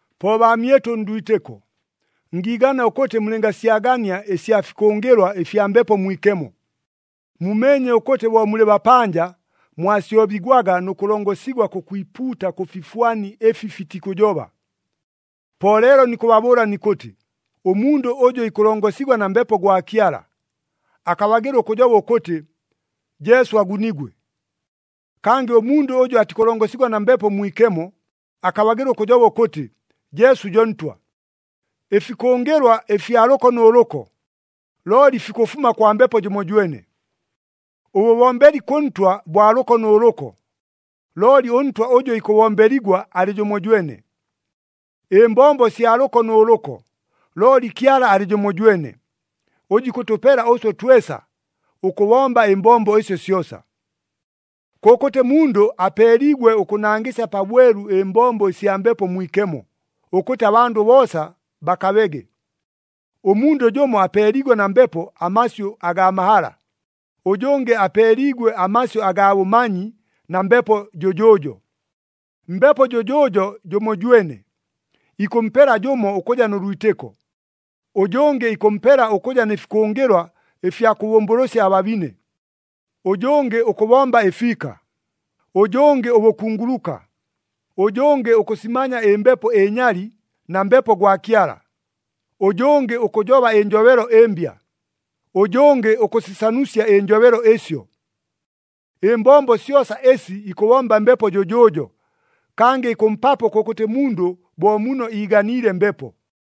Po baamyɨtʉ ndwitɨko, ngiigana ʉkʉtɨ mulɨngasyagania ɨsya fikʉngɨlwa ɨfya Mbepo Mwikemo. Mumeenye ʉkʉtɨ bo mulɨ bapanja, mwasyobigwaga nʉ kʉlongosigwa kʉkwipuuta kʉ fifwani ɨfi fitikʉjoba. Po leelo nikʉbabʉʉla nikʉtɨ, ʉmundʉ ʉjʉ ikʉlongosigwa na Mbepo gwa Kyala, akabagɨla ʉkʉjoba ʉkʉtɨ, “Jesu agunigwe.” Kangɨ ʉmundʉ ʉjʉ atikʉlongosigwa na Mbepo Mwikemo, akabagɨla ʉkʉjoba ʉkʉtɨ, “Jesu jo Ntwa.” Ɨfikʉngɨlwa ɨfya lʉko nʉ lʉko, looli fikʉfuma kwa Mbepo jʉmojwene. Ʉbʉbombeli kʉ Ntwa bwa lʉko nʉ lʉko, looli ʉNtwa ʉjʉ ikʉbombeligwa alɨ jʉmojwene. Ɨmbombo sya lʉko nʉ lʉko, looli Kyala alɨ jʉmojwene, ʉjʉ ikʉtʉpela ʉswe twesa, ʉkʉbomba ɨmbombo ɨsyo syosa. Kʉkʉtɨ mundʉ apeeliigwe ʉkʉnangɨsya pabwelu ɨmbombo ɨsya Mbepo Mwikemo, ʉkʉtɨ abandʉ boosa bakabege. Ʉmundʉ jʉmo apeeliigwe na Mbepo amasyʉ agaa mahala, ʉjʉngɨ apeeliigwe amasyʉ agaa bʉmanyi na Mbepo jʉjʉʉjo. Mbepo jʉjʉʉjo jʉmojwene, ikʉmpela jʉmo ʉkʉja nʉ lwitɨko, ʉjʉngɨ ikʉmpela ʉkʉja nɨ fikʉngɨlwa ɨfya kʉbʉmbʉlʉsya ababine, ʉjʉngɨ ʉkʉbomba ɨfiika, ʉjʉngɨ ʉbʉkunguluka, ʉjʉngɨ ʉkʉsimanya ɨmbepo ɨnyali na Mbepo gwa Kyala, ʉjʉngɨ ʉkʉjoba ɨnjobelo ɨmbya, ʉjʉngɨ ʉkʉsisanusya ɨnjobelo ɨsyo. Ɨmbombo syosa ɨsi ikʉbomba Mbepo jʉjʉʉjo, kangɨ ikʉmpapo kʉkʉtɨ mundʉ bo muno iiganiile Mbepo.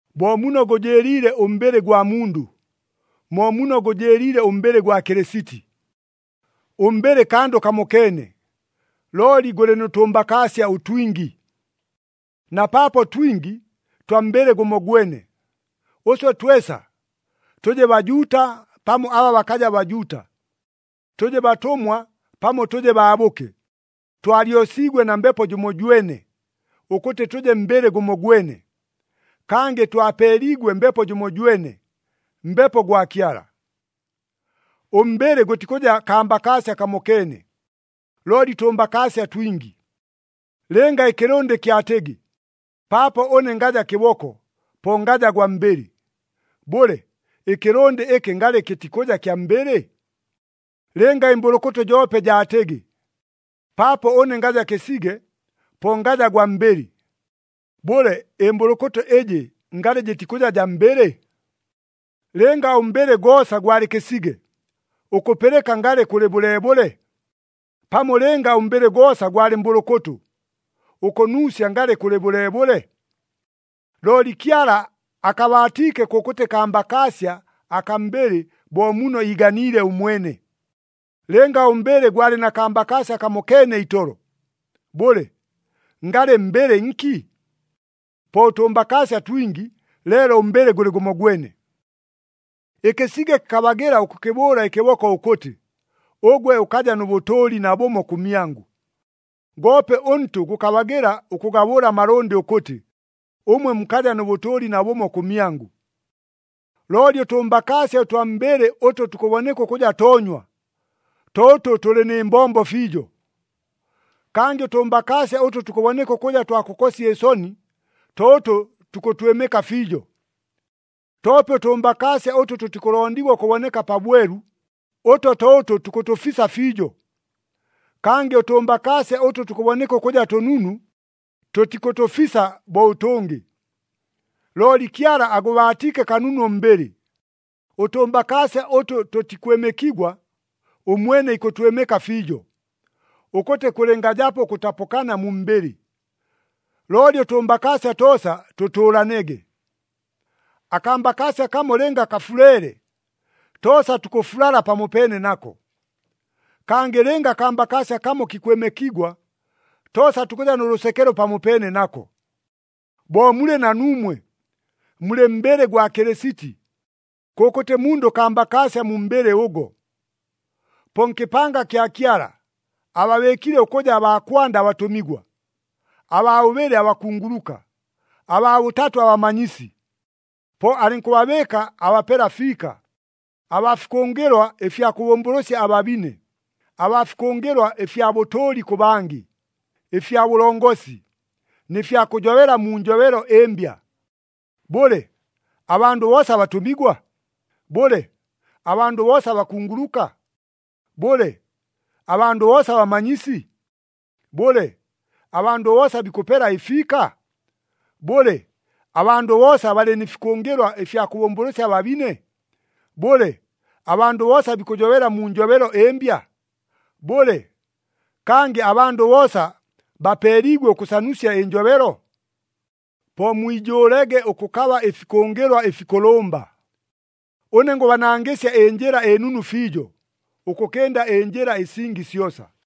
Bo muno gʉjɨɨliile ʉmbɨlɨ gwa mundʉ, mo muno gʉjɨɨliile ʉmbɨlɨ gwa Kɨlɨsiti. Ʉmbɨlɨ kandʉ kamokeene, looli gʉlɨ nʉ tʉmbakaasya ʉtwingi. Na paapo twingi, twa mbɨlɨ gʉmogwene. Ʉswe twesa, tʉje Bajuuta pamo aba bakaja Bajuuta, tʉje batʉmwa pamo tʉje baabʉke, twalyosiigwe na Mbepo jʉmojwene, ʉkʉtɨ tʉje mbɨlɨ gʉmogwene. Kangɨ twapeeliigwe Mbepo jʉmojwene, Mbepo gwa Kyala. Ʉmbɨlɨ gʉtikʉja kambakaasya kamokeene, looli tʉmbakaasya twingi. Lɨnga ɨkɨlʉndɨ kyatɨgɨ, “Paapo ʉne ngaja kɨboko, po ngaja gwa mbɨlɨ,” bʉle, ɨkɨlʉndɨ ɨkɨ ngalɨ kɨtikʉja kya mbɨlɨ? Lɨnga ɨmbʉlʉkʉtʉ joope jaatɨgɨ, “Paapo ʉne ngaja kɨsige, po ngaja gwa mbɨlɨ,” bʉle, ɨmbʉlʉkʉtʉ ɨjɨ ngalɨ jɨtikʉja jaa mbɨlɨ? Lɨnga ʉmbɨlɨ goosa gwalɨ kɨsige, ʉkʉpɨlɨka ngalɨ kʉlɨ bʉleebʉle? Pamo lɨnga ʉmbɨlɨ goosa gwalɨ mbʉlʉkʉtʉ, ʉkʉnuusya ngalɨ kʉlɨ bʉleebʉle? Looli Kyala akabaatiike kʉkʉtɨ kambakaasya akaa mbɨlɨ bo muno iiganiile ʉmwene. Lɨnga ʉmbɨlɨ gwalɨ na kambakaasya kamokeene itolo, bʉle, ngalɨ mbɨlɨ nki? Po ʉtʉmbakaasya twingi, leelo ʉmbɨlɨ gʉlɨ gʉmogwene. Ɨkɨsige kɨkabagɨla ʉkʉkɨbʉʉla ɨkɨboko ʉkʉtɨ, “Ʉgwe ʉkaja nʉ bʉtʉʉli nabʉmo kʉmyangʉ.” Goope ʉntʉ gʉkabagɨla ʉkagabʉʉla amalʉndɨ ʉkʉtɨ, “Ʉmwe mukaja nʉ bʉtʉʉli nabʉmo kʉmyangʉ.” Looli ʉtʉmbakaasya ʉtwa mu mbɨlɨ ʉtʉ tukʉboneka ʉkʉja toonywa, to ʉtʉ tʉlɨ nɨ mbombo fiijo. Kangɨ ʉtʉmbakaasya ʉtʉ tukʉboneka ʉkʉja twa kʉkosya ɨsoni, to ʉtʉ tukʉtwɨmɨka fiijo. Toope ʉtʉmbakaasya ʉtʉ tʉtikʉlondigwa ʉkʉboneka pabwelu, ʉto to ʉtʉ tukʉtʉfisa fiijo. Kangɨ ʉtʉmbakaasya ʉtʉ tukʉboneka ʉkʉja tʉnunu, tʉtikʉtʉfisa bo ʉtʉngɨ. Looli Kyala agʉbaatiike kanunu ʉmbɨlɨ, ʉtʉmbakaasya ʉtʉ tʉtikwɨmɨkigwa, ʉmwene ikʉtwɨmɨka fiijo, ʉkʉtɨ kʉlɨngajapo ʉkʉtapʉkana mu mbɨlɨ, looli ʉtʉmbakaasya toosa tʉtʉʉlanege. Akambakaasya kamo lɨnga kafuleele, toosa tukʉfulala pamopeene nako. Kangɨ lɨnga akambakaasya kamo kikwɨmɨkigwa, toosa tukʉja nʉ lʉsekelo pamopeene nako. Bo mulɨ na nuumwe, mulɨ mbɨlɨ gwa Kɨlɨsiti. Kʉkʉtɨ mundʉ kambakaasya mu mbɨlɨ ʉgo. Po nkɨpanga kya Kyala, ababɨɨkile ʉkʉja baa kwanda abatʉmigwa, abaa bʉbɨlɨ abakunguluka, abaa bʉtatʉ abamanyisi. Po alɨnkʉbabɨɨka abapela fiika, abaa fikʉngɨlwa ɨfya kʉbʉmbʉlʉsya ababine, abaa fikʉngɨlwa ɨfya bʉtʉʉli kʉ bangɨ, ɨfya bʉlongosi, nɨ fya kʉjobela mu njobelo ɨmbya. Bʉle, abandʉ boosa batʉmigwa? Bʉle, abandʉ boosa bakunguluka? Bʉle, abandʉ boosa bamanyisi? Bʉle, abandʉ boosa bikʉpela ɨfiika? Bʉle, abandʉ boosa balɨ nɨ fikʉngɨlwa ɨfya kʉbʉmbʉlʉsya ababine? Bʉle, abandʉ boosa bikʉjobela mu njobelo ɨmbya? Bʉle, kangɨ abandʉ boosa bapeeliigwe ʉkʉsanusya ɨnjobelo? Po mwijʉʉlege ʉkʉkaba ɨfikʉngɨlwa ɨfikʉlʉmba. Ʉne ngʉbanangɨsya ɨnjɨla ɨnunu fiijo, ʉkʉkɨnda ɨnjɨla ɨsingi syosa.